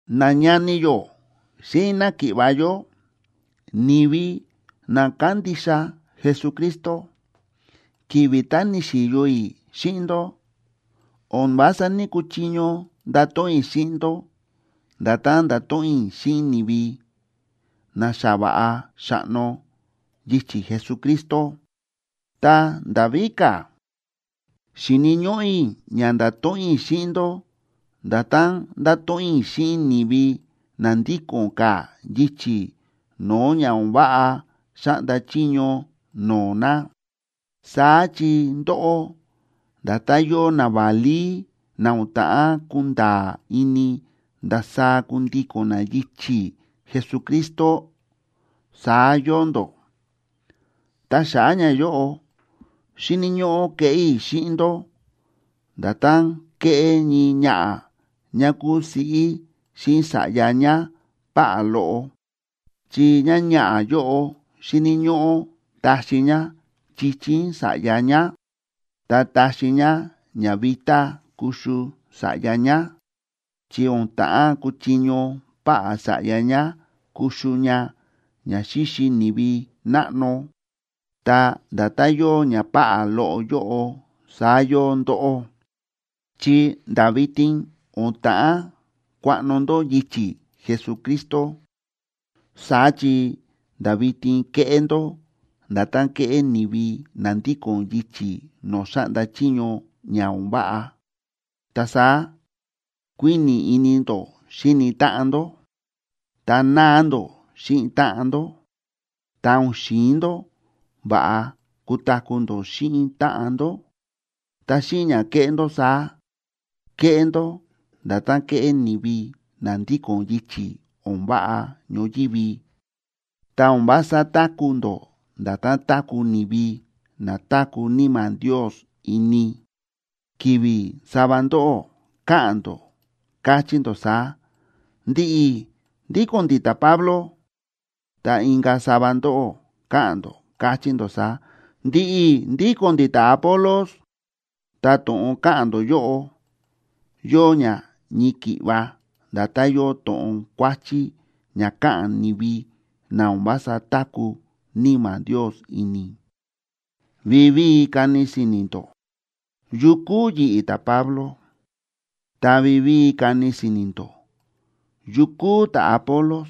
Nañani yó xíꞌin náki̱ꞌva̱ yó, ni̱vi na kándixa Jesucristo, ki̱vi̱ tá ni̱xi̱yo i̱ xíꞌin ndó, o̱n vása ní‑kuchiño ndato̱ꞌon i̱ xíꞌin ndó nda̱tán ndáto̱ꞌon i̱ xíꞌin ni̱vi na xa va̱ꞌa xa̱ꞌno yichi̱ Jesucristo. Ta nda̱ víka̱, xi̱ni̱ ñóꞌó i̱ ña nda̱to̱ꞌon i̱ xíꞌin ndó nda̱tán ndáto̱ꞌon i̱ xíꞌin ni̱vi na ndíko̱n ka̱ yichi̱ no̱o̱ ña o̱n váꞌa xáꞌnda chiño no̱o̱ na. Saá chi ndóꞌó, nda̱tán yóo naválí na o̱n ta̱ꞌán kunda̱a̱ ini ndasaá kundíko̱n na yichi̱ Jesucristo, saá yóo ndó. Ta xa̱ꞌa̱ ñayóꞌo, xi̱ni̱ ñóꞌó ke̱ꞌé i̱ xíꞌin ndó nda̱tán kéꞌé ñii ñaꞌa̱ ñá kúu siꞌí xíꞌin sa̱ꞌya ñá páꞌá loꞌo. Chi ñáñaꞌa̱ yóꞌo xíni̱ ñóꞌó taxi ñá chichín sa̱ꞌya ñá, ta táxi ñá ñavitá kuxu sa̱ꞌya ñá, chi o̱n ta̱ꞌán kuchiño páꞌá sa̱ꞌya ñá kuxu ña ña xíxi ni̱vi náꞌno. Ta nda̱tán yóo ñapáꞌá loꞌo yóꞌo saá yóo ndóꞌó, chi nda̱ vitin o̱n ta̱ꞌán kuaꞌno ndó yichi̱ Jesucristo. Saá chi nda̱ vitin kéꞌé ndó nda̱tán kéꞌé ni̱vi na ndíko̱n yichi̱ no̱o̱ xáꞌnda chiño ña o̱n váꞌa. Ta saá kuíni̱ ini ndó xíni táꞌan ndó, ta náa ndó xíꞌin táꞌan ndó, ta o̱n xi̱in ndó va̱ꞌa kutaku̱ ndó xíꞌin táꞌan ndó. Ta xíꞌin ña kéꞌé ndó saá, kéꞌé ndó nda̱tán kéꞌé ni̱vi na ndíko̱n yichi̱ o̱n váꞌa ñoyívi, ta o̱n vása táku̱ ndó nda̱tán táku̱ ni̱vi na táku̱ Níma̱ Ndios ini. Ki̱vi̱ sava ndóꞌó káꞌa̱n ndó, káchí ndó saá: “Ndi̱ꞌi̱ ndíko̱n ndi̱ ta̱Pablo”, ta inka̱ sava ndóꞌó káꞌa̱n ndó, káchí ndó saá: “Ndi̱ꞌi̱ ndíko̱n ndi̱ ta̱Apolos”, ta to̱ꞌon káꞌa̱n ndó yóꞌo, yóo ña ñii ki̱ꞌva nda̱tán yóo to̱ꞌon kuáchí ña káꞌa̱n ni̱vi na o̱n vása táku̱ Níma̱ Ndios ini. Vivíi kani si̱ni̱ ndó, ¿yu kúu yi̱ꞌi̱, ta̱Pablo? Ta vivíi kani si̱ni̱ ndó, ¿yu kúu ta̱Apolos?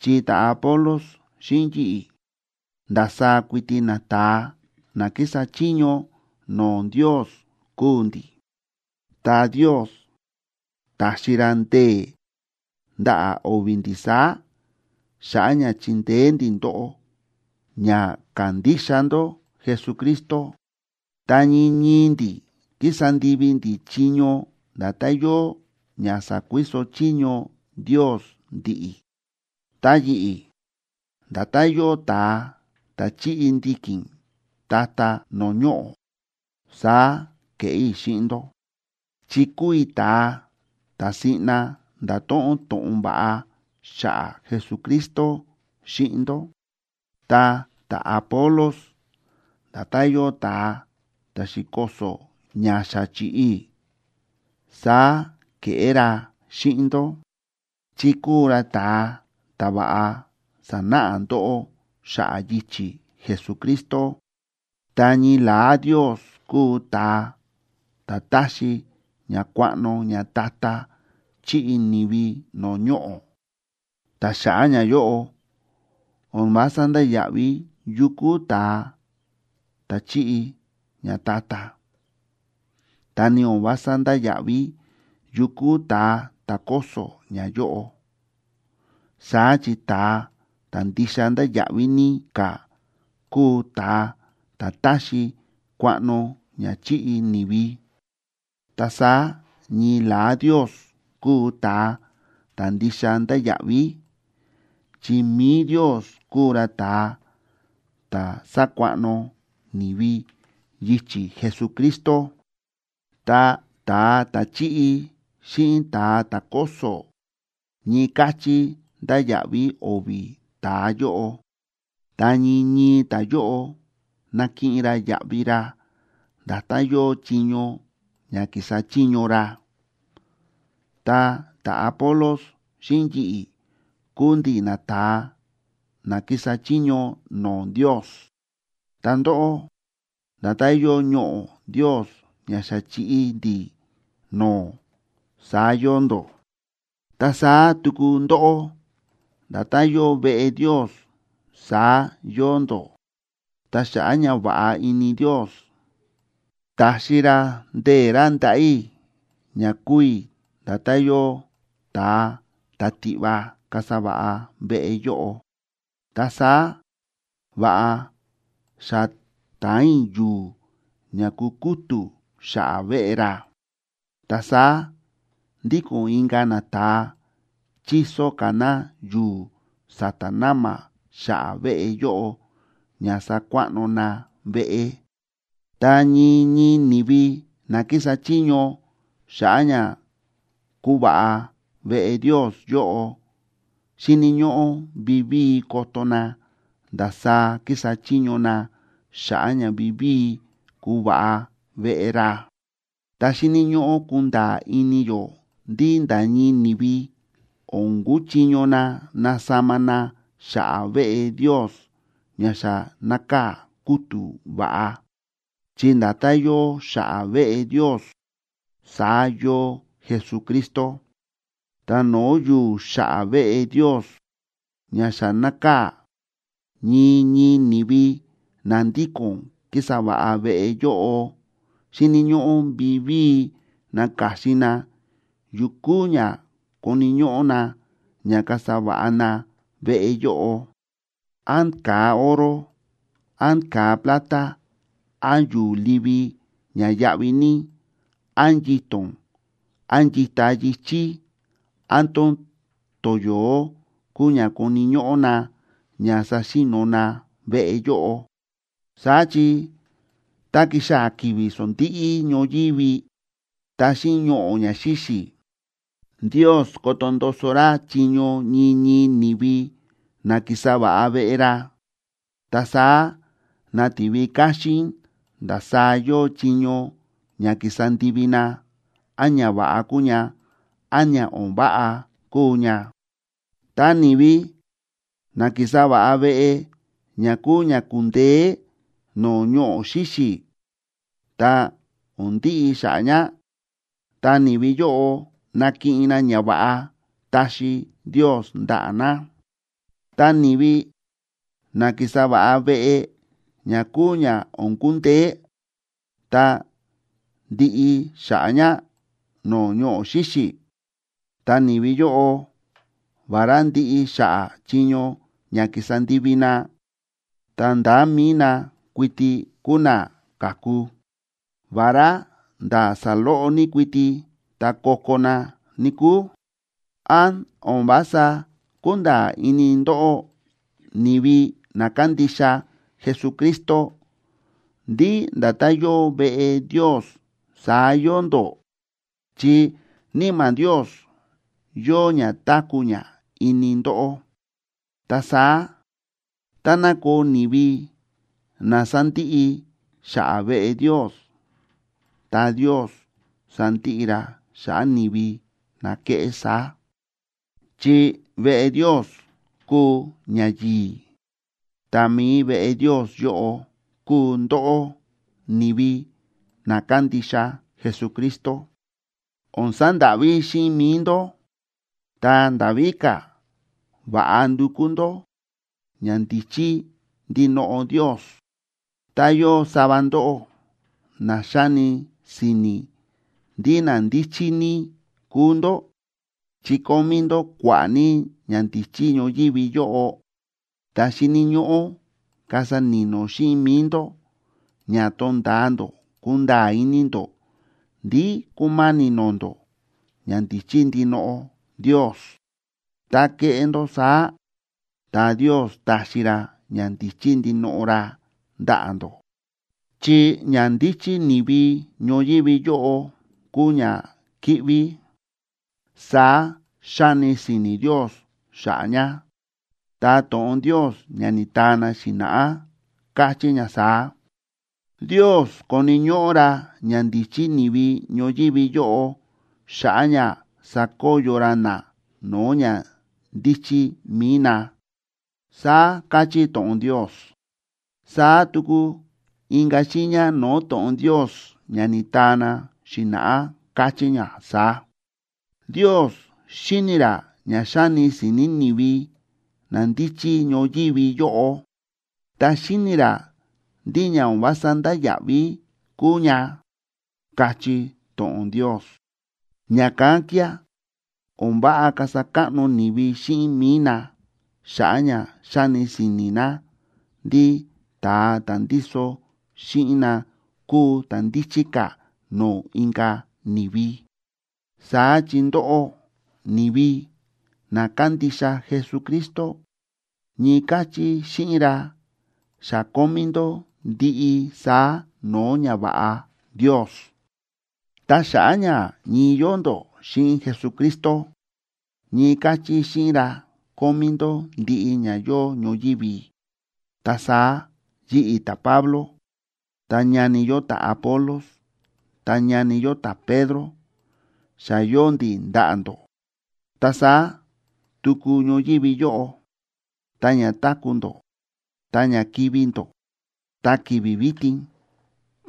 Chi ta̱Apolos xíꞌin yi̱ꞌi̱, ndasaá kuiti nata̱a na kísa chiño no̱o̱ Ndios kúu ndi̱. Ta Ndios ta̱xi ra ndee̱ ndaꞌa̱ o̱vi̱ ndi̱ saá xa̱ꞌa̱ ña chi̱ndeé ndi̱ ndóꞌó ña ka̱ndixa ndó Jesucristo. Ta ñii ñii ndi̱ kísa ndivi ndi̱ chiño nda̱tán yóo ña sa̱kuiso chiño Ndios ndi̱ꞌi̱. Ta yi̱ꞌi̱, nda̱tán yóo ta̱a ta̱ chi̱ꞌi ndiki̱n ta̱ta̱ no̱o̱ ñoꞌo̱, saá ke̱ꞌé i̱ xíꞌin ndó, chi kúu i̱ ta̱a ta̱ siꞌna nda̱to̱ꞌon to̱ꞌon va̱ꞌa xa̱ꞌa̱ Jesucristo xíꞌin ndó. Ta ta̱Apolos, nda̱tán yóo ta̱a ta̱ xi̱koso̱ ña xa chi̱ꞌi i̱, saá ke̱ꞌé ra xíꞌin ndó, chi kúu ra ta̱a ta̱ va̱ꞌa sa̱náꞌa ndóꞌó xa̱ꞌa̱ yichi̱ Jesucristo. Ta ñii la̱á Ndios kúu ta̱a ta̱ táxi ña kuaꞌno ñata̱ta̱ chi̱ꞌi ni̱vi no̱o̱ ñoꞌo̱. Ta xa̱ꞌa̱ ñayóꞌo, o̱n vása ndáya̱ꞌví yu kúu ta̱a ta̱ chíꞌi ñata̱ta̱, ta ni o̱n vása ndáya̱ꞌví yu kúu ta̱a ta̱ kóso̱ ñayóꞌo. Saá chi ta̱a ta̱ ndixa ndáya̱ꞌví ní ka̱ kúu ta̱a ta̱ táxi kuaꞌno ña chi̱ꞌi ni̱vi. Ta saá ñii la̱á Ndios kúu ta̱a ta̱ ndixa ndáya̱ꞌví, chi mi̱i Ndios kúu ra ta̱a ta̱ sákuaꞌno ni̱vi yichi̱ Jesucristo. Ta ta̱a ta̱ chíꞌi xíꞌin ta̱a ta̱ kóso̱, ñii káchí ndáya̱ꞌví o̱vi̱ ta̱a yóꞌo. Ta ñii ñii ta̱yóꞌo nakiꞌin ra yaꞌvi ra nda̱tán yóo chiño ña ki̱sa chiño ra. Ta ta̱Apolos xíꞌin yi̱ꞌi̱ kúu ndi̱ nata̱a na kísa chiño no̱o̱ Ndios. Ta ndóꞌó, nda̱tán yóo ñoꞌo̱ Ndios ña xa chi̱ꞌi ndi̱ no̱o̱, saá yóo ndó. Ta saá tuku ndóꞌó, nda̱tán yóo veꞌe Ndios, saá yóo ndó. Ta xa̱ꞌa̱ ñava̱ꞌa ini Ndios, ta̱xi ra ndee̱ ra ndaꞌa̱ i̱ ña kúu i̱ nda̱tán yóo ta̱a ta̱ tiꞌva kasa va̱ꞌa veꞌe yóꞌo. Ta saá va̱ꞌa xa ta̱an i̱ yu̱u̱ ña ku̱kútu̱ xa̱ꞌa̱ veꞌe ra. Ta saá ndíko̱n inka̱ nata̱a chíso ka̱ na yu̱u̱ sa̱ta̱ na̱ma̱ xa̱ꞌa̱ veꞌe yóꞌo ña sakuaꞌno na veꞌe. Ta ñii ñii ni̱vi na kísa chiño xa̱ꞌa̱ ña kuva̱ꞌa veꞌe Ndios yóꞌo xíni̱ ñóꞌó vivíi koto na ndasaá kísa chiño na xa̱ꞌa̱ ña vivíi kuva̱ꞌa veꞌe ra. Ta xíni̱ ñóꞌó kunda̱a̱ ini yó ndí nda̱ ñii ni̱vi o̱n kuchiño na nasama na xa̱ꞌa̱ veꞌe Ndios ña xa nákaa̱ kútu̱ va̱ꞌa, chi nda̱tán yóo xa̱ꞌa̱ veꞌe Ndios saá yóo Jesucristo. Ta no̱o̱ yu̱u̱ xa̱ꞌa̱ veꞌe Ndios ña xa nákaa̱, ñii ñii ni̱vi na ndíko̱n kísa va̱ꞌa veꞌe yóꞌo xíni̱ ñóꞌó vivíi naka̱xin na yukú ña koni̱ ñóꞌó na ña kasa va̱ꞌa na veꞌe yóꞌo: án ka̱a oro, án ka̱a plata, án yu̱u̱ livi ña yáꞌví ní, án yito̱n, án yita yi̱chí, án tón toyo̱ó kuu ña koni̱ ñóꞌó na ña saxi̱no̱ na veꞌe yóꞌo. Saá chi, tá ki̱xaa̱ ki̱vi̱ sondíꞌí ñoyívi, ta xíꞌin ñoꞌo̱ ña xíxi̱, Ndios koto ndoso ra chiño ñii ñii ni̱vi na ki̱sa va̱ꞌa veꞌe ra, ta saá nativi káxín ndasaá yóo chiño ña ki̱sa ndivi na, án ñava̱ꞌa kúu ña, án ña o̱n váꞌa kúu ña. Ta ni̱vi na ki̱sa va̱ꞌa veꞌe ña kúu ña kundeé no̱o̱ ñoꞌo̱ xíxi̱ ta o̱n ndiꞌi xa̱ꞌa̱ ña, ta ni̱vi yóꞌo nakiꞌin na ñava̱ꞌa taxi Ndios ndaꞌa̱ na. Ta ni̱vi na ki̱sa va̱ꞌa veꞌe ña kúu ña o̱n kundeé, ta ndiꞌi xa̱ꞌa̱ ña no̱o̱ ñoꞌo̱ xíxi̱, ta ni̱vi yóꞌo, vará ndiꞌi xa̱ꞌa̱ chiño ña ki̱sa ndivi na, ta ndá mi̱i na kuiti kuu na ka̱ku, vará ndá saloꞌo ní kuiti tá ko̱ko̱ na, níkúu. ¿Án o̱n vása kúnda̱a̱ ini ndóꞌó, ni̱vi na kándixa Jesucristo, ndí nda̱tán yóo veꞌe Ndios saá yóo ndó?, chi Níma̱ Ndios yóo ña táku̱ ña ini ndóꞌó. Ta saá táná koo ni̱vi na sandiꞌi xa̱ꞌa̱ veꞌe Ndios, ta Ndios sandiꞌi ra xa̱ꞌa̱ ni̱vi na keꞌé saá. Chi veꞌe Ndios kúu ñayi̱i̱, ta mi̱i veꞌe Ndios yóꞌo kúu ndóꞌó, ni̱vi na kándixa Jesucristo. O̱n sandáꞌví xíꞌin mi̱i ndó, ta nda̱ víka̱, va̱ꞌa ndukú ndó ñandíchí ndinoꞌo Ndios. Tá yóo sava ndóꞌó na xáni si̱ni̱ ndí na ndíchí ní kúu ndó, chi kómí ndó kua̱ꞌa̱ ní ñandíchí ñoyívi yóꞌo, ta xíni̱ ñóꞌó kasa ni̱no̱ xíꞌin mi̱i ndó ña tonda̱a ndó kunda̱a̱ ini ndó ndí kúma̱ni̱ no̱o̱ ndó ñandíchí ndinoꞌo Ndios. Tá keꞌé ndó saá, ta Ndios taxi ra ñandíchí ndinoꞌo ra ndaꞌa̱ ndó. Chi ñandíchí ni̱vi ñoyívi yóꞌo kúu ñakíꞌví, saá xáni si̱ni̱ Ndios xa̱ꞌa̱ ña. Ta to̱ꞌon Ndios ña ni̱taa na xi̱na̱ꞌá káchí ña saá: “Ndios koni̱ ñóꞌó ra ñandíchí ni̱vi ñoyívi yóꞌo, xa̱ꞌa̱ ña sakoyo ra na no̱o̱ ñandíchí mi̱i na”, saá káchí to̱ꞌon Ndios. Saá tuku inka̱ xiiña no̱o̱ to̱ꞌon Ndios ña ni̱taa na xi̱na̱ꞌá káchí ña saá: “Ndios xíni̱ ra ña xáni si̱ni̱ ni̱vi na ndíchí ñoyívi yóꞌo, ta xíni̱ ra ndí ña o̱n vása ndáya̱ꞌví kúu ña”, káchí to̱ꞌon Ndios. Ña̱kán kía̱ o̱n váꞌa kasa káꞌno ni̱vi xíꞌin mi̱i na xa̱ꞌa̱ ña xáni si̱ni̱ na ndí ta̱a ta̱ ndíso xíꞌin na kúu ta̱ ndíchí ka̱ no̱o̱ inka̱ ni̱vi. Saá chi ndóꞌó, ni̱vi na kándixa Jesucristo, ñii káchí xíꞌin ra xa kómí ndó ndiꞌi saá no̱o̱ ñava̱ꞌa Ndios. Ta xa̱ꞌa̱ ña ñii yóo ndó xíꞌin Jesucristo, ñii káchí xíꞌin ra kómí ndó ndiꞌi ña yóo ñoyívi. Ta saá yi̱ꞌi̱ ta̱Pablo, ta ñani yó ta̱Apolos, ta ñani yó ta̱Pedro, xa yóo ndi̱ ndaꞌa̱ ndó. Ta saá tuku ñoyívi yóꞌo, ta ña táku̱ ndó, ta ña kivi̱ ndó, ta ki̱vi̱ vitin,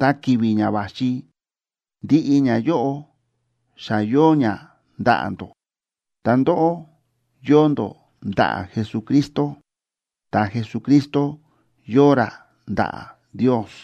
ta ki̱vi̱ ña va̱xi, ndiꞌi ñayóꞌo xa yóo ña ndaꞌa̱ ndó. Ta ndóꞌó, yóo ndó ndaꞌa̱ Jesucristo, ta Jesucristo yóo ra ndaꞌa̱ Ndios.